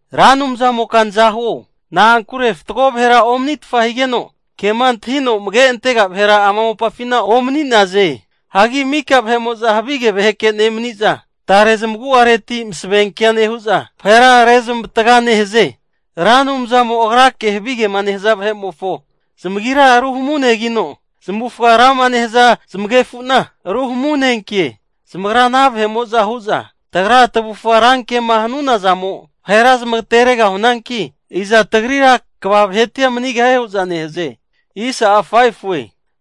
Ra Anumzamoka nazahuo, na'ankure fatgo vahera omanitfa higeno, kema antahino amage antega vahera ama mopafina omani'naze. Hagi mika vahe'mo'za havige vaheke nemani'za, tare zamagu'areti masavenkea nehu'za vahera rezamavataga nehaze. Ra Anumzamo Agrake havigema nehaza vahe'mofo zamagira ruhamunegino, zamavufaga rama nehaza zamaganefu'na ruhamunenkie. Zamagra ana vahe'mo'za hu'za, tagra tavufga rankema hanuna zamo vahera zmagateregahunanki, iza tagrira kva vahetia manigahie hu'za nehaze.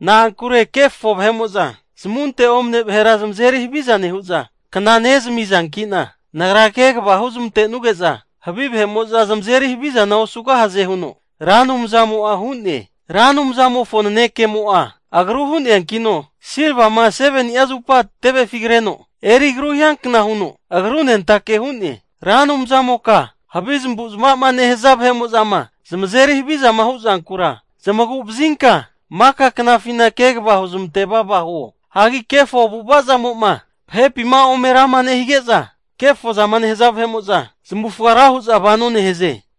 Na'ankure kefo vahe'mo'za zamunte omane vahera zamazeri haviza nehu'za, kna nezamizanki'na, Nagra kegava huzmante'nuge'za havi vahe'mo'za zamazeri havizana osugahaze huno Ra Anumzamo'a hu'ne. Ra Anumzamofo nanekemo'a, agru hu'neankino silvama 7ni'a zupa tevefi kreno eri agru hiankna huno agrunentake hu'ne. Ra Anumzamoka, havi zamavu zamava'ma nehaza vahe'mo'zama zamazeri havizama hu'zankura zamagu'vazinka maka knafina kegava huzamante vava huo. Hagi kefo avu'avazamo'ma vahepima ome rama nehige'za kefozama nehaza vahe'mo'za zamavufaga ra huza vano nehaze.